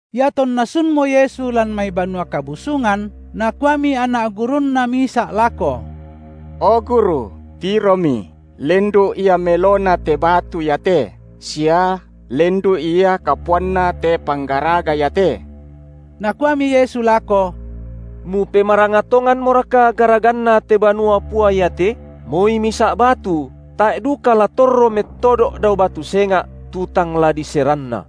Iatonna sunmo Yesu lan mai Banua Kabusungan, nakuami anak gurunNa misa’ lako: O Guru, tiromi lendu’ ia melona te batu iate sia lendu’ ia kapuanna te panggaraga iate! Nakuami Yesu lako: Mupemaranga tonganmoraka garaganna te banua pua iate? Moi misa’ batu tae’ duka la torro mettodo’ dao batu senga’, tu tang la diseranna.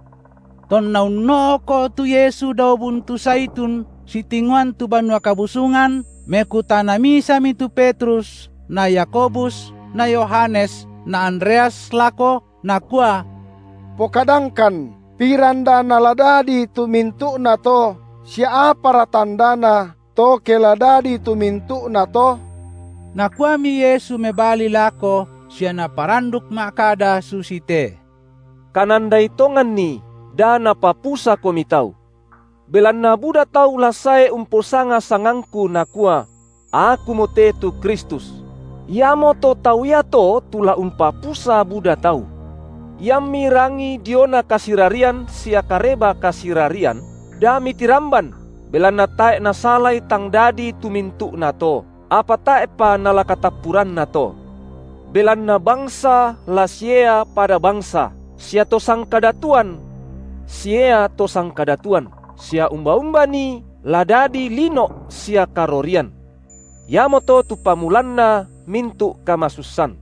Tonna unno’ko’ tu Yesu dao buntu Zaitun sitingoan tu Banua Kabusungan, mekutana misami tu Petrus na Yakobus na Yohanes na Andreas lako, nakua: Pokadangkan piranda nala dadi tu mintu’nato sia apara tandana, to ke la dadi tu mintu’nato? Nakuami Yesu mebali lako sia Naparanduk ma’kada susite: Kanandai tonganni, da napapusakomi tau. Belanna buda tau la sae umposanga sangangKu, nakua: Akumote tu Kristus! iamoto tau iato tu la umpapusa buda tau. Iammi rangi diona kasirarian sia kareba kasirarian, da mitiramban belanna tae’ nasalai tang dadi tu mintu’nato, apa tae’pa nala katappurannato. Belanna bangsa la siea pada bangsa sia to sangkadatuan siea to sangkadatuan. Sia umba-umba nii la dadi lino’ sia karorian. Iamoto tu pamulanna mintu’ kamasussan.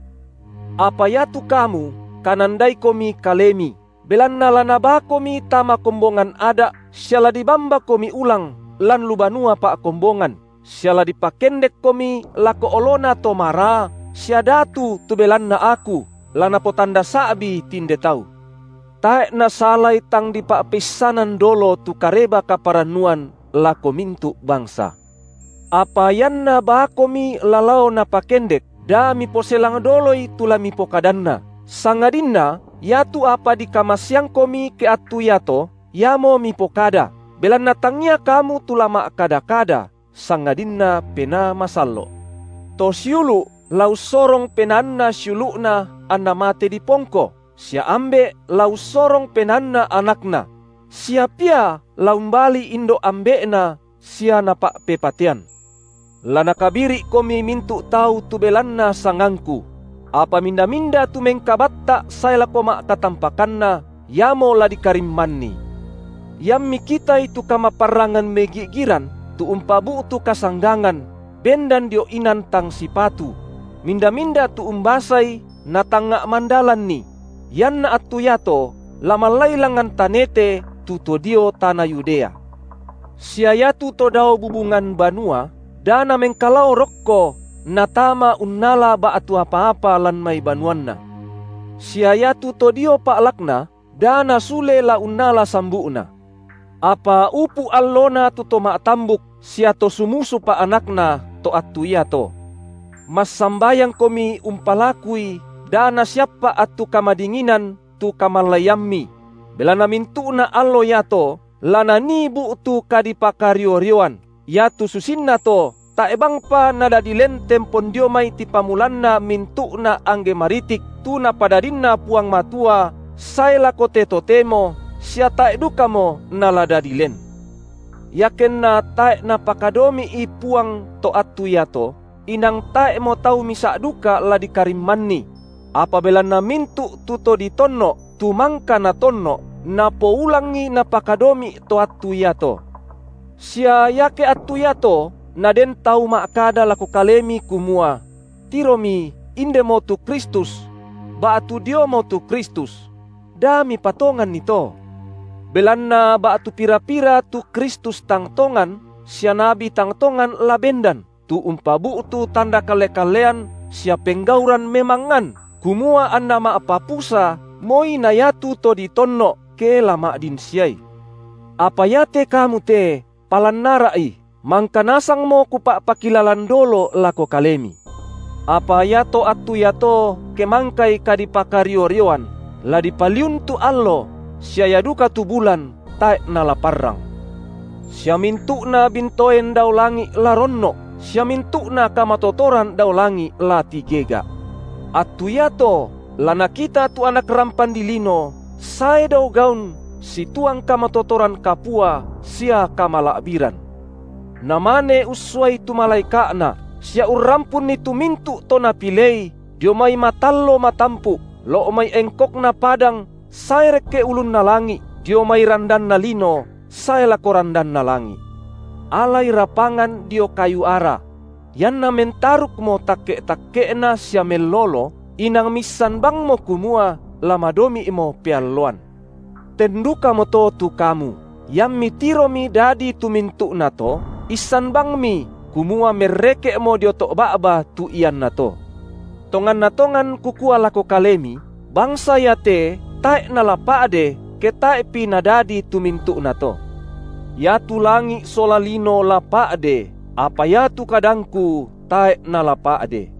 Apa iatu kamu kanandaikomi kalemi, belanna la nabaakomi tama kombongan ada’ sia la dibambakomi ulang lan lu banua pa’kombongan, sia la dipakendekkomi lako olona to maraa sia datu tu belanna Aku, la napotanda sa’bi tinde tau. Tae’ nasalai tang dipa’peissanan dolo tu Kareba kaparannuan lako mintu’ bangsa. Apa ianna baakomi la lao napakendek, da miposelang doloi tu la mipokadanna, sangadinna iatu apa dikamaseangkomi ke attu iato, iamo mipokada, belanna tangia kamu tu la ma’kada-kada, sangadinna Penaa Masallo’. To siulu’ la ussorong penaanna siulu’na anna mate dipongko, sia ambe’ la ussorong penaanna anakna; sia pia la umbali indo’ ambe’na sia napa’pepatean. La nakabiri’komi mintu’ tau tu belanna sangangKu; apa minda-minda tu mengkabatta’ sae lako ma’katampakanna, iamo la dikarimmanni. Iammi kitai tu kamaparrangan megi’giran tu umpabu’tu kasanggangan, bendan dio inan tang sipatu – minda-minda tu umbasai natangnga’ mandalanni – ianna attu iato la mallai langan tanete tu to dio tana Yudea. Sia iatu to dao bubungan banua, da namengkalao rokko natama unnala ba’tu apa-apa lan mai banuanna. Sia iatu to dio pa’lakna, da nasule la unnala sambu’na. Apa upu’ allona tu to ma’tambuk sia to sumusupa anakna to attu iato. Massambayangkomi umpalakui da nasiappa’ attu kamadinginan tu kamallaiammi; belanna mintu’na allo iato la nanii bu’tu kadipakario-rioan, iatu susinnato tae’ bangpa nadadi len tempon dio mai tipamulanna mintu’na angge maritik tu Napadadinna Puang Matua sae lako te totemo, sia tae’ dukamo nala dadi len. Iakenna tae’ Napakadomi’i Puang to attu iato, inang tae’mo tau misa’ duka la dikarimmanni; apa belanna mintu’ tu to ditonno’, tu mangka Natonno’, napoulangi Napakadomi’ to attu iato. Sia iake attu iato, naden tau ma’kada lako kalemi kumua: Tiromi indemo tu Kristus! ba’tu: Diomo tu Kristus! da mipatonganni to! Belanna ba’tu pira-pira tu Kristus tang tongan sia nabi tang tongan la bendan, tu umpabu’tu tanda kalle-kallean sia penggauran memangngan, kumua anna ma’papusa moi na iatu to ditonno’, ke la ma’din siai. Apa iate kamu te palan ara’i! mangka nasangmo Kupa’pakilalan dolo lako kalemi. Apa iato attu iato ke mangkai kadipakario-rioan, la dipaliun tu allo sia ia duka tu bulan tae’ nala parrang. Sia mintu’na bintoen dao langi’ la ronno’, sia mintu’na kamatotoran dao langi’ la tigega’. Attu iato la nakita tu Anak rampan dilino sae dao gaun situang kamatotoran kapua sia kamala’biran. Namane ussuai tu malaeka’Na sia urrampunni tu mintu’ to Napilei dio mai matallo matampu’ lo’ mai engkokna padang sae rekke ulunna langi’, dio mai randanna lino sae lako randanna langi’. Alai rapangan dio kayu ara: ianna mentarukmo takke’-takke’na sia mellolo, inang miissan bangmo kumua la madomi’mo pealloan. Ten dukamoto tu kamu, iammi tiromi dadi tu mintu’nato, issan bangmi, kumua merreke’mo dio to’ ba’ba tu iannato. Tonganna tongan Kukua lako kalemi: Bangsa iate tae’ nala pa’de, ke tae’pi nadadi tu mintu’nato. Iatu langi’ sola lino la pa’de, apa iatu kadangKu tae’ nala pa’de.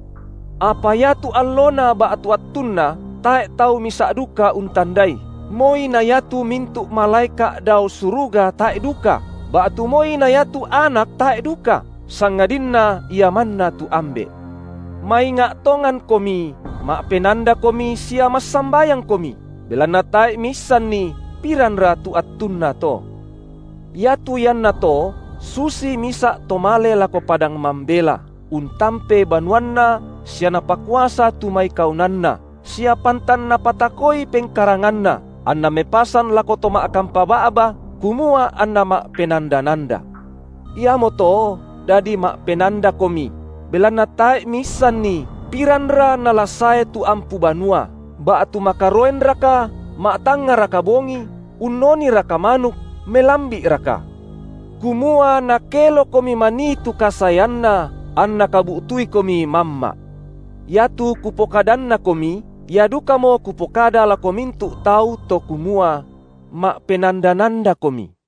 Apa iatu allona ba’tu attunna tae’ tau misa’ duka untandai, moi na iatu mintu’ malaeka’ dao suruga tae’ duka, ba’tu moi na iatu Anak tae’ duka, sangadinna Ia manna tu Ambe’. Mainga’ tongankomi, ma’penandakomi sia massambayangkomi, belanna tae’ miissanni, piranra tu attunna to. Iatu iannato susi misa’ to male lako padang mambela, untampe banuanna sia napakuasa tu mai kaunanna, sia pantan napatakoi pengkaranganna, anna mepasan lako to ma’kampa ba’ba, kumua anna ma’penanda-nanda. Iamoto dadi ma’penandakomi, belanna tae’ miisanni, piranra nala sae tu ampu banua, ba’tu makaroenraka, ma’tangngaraka bongi, unnoniraka manuk, melambi’raka. Kumua nakelokomi manii tu kasaeanna, anna kabu’tuikomi mamma’. Iatu kupokadannakomi, ia dukamo Kupokada lako mintu’ tau to kumua: Ma’penanda-nandakomi!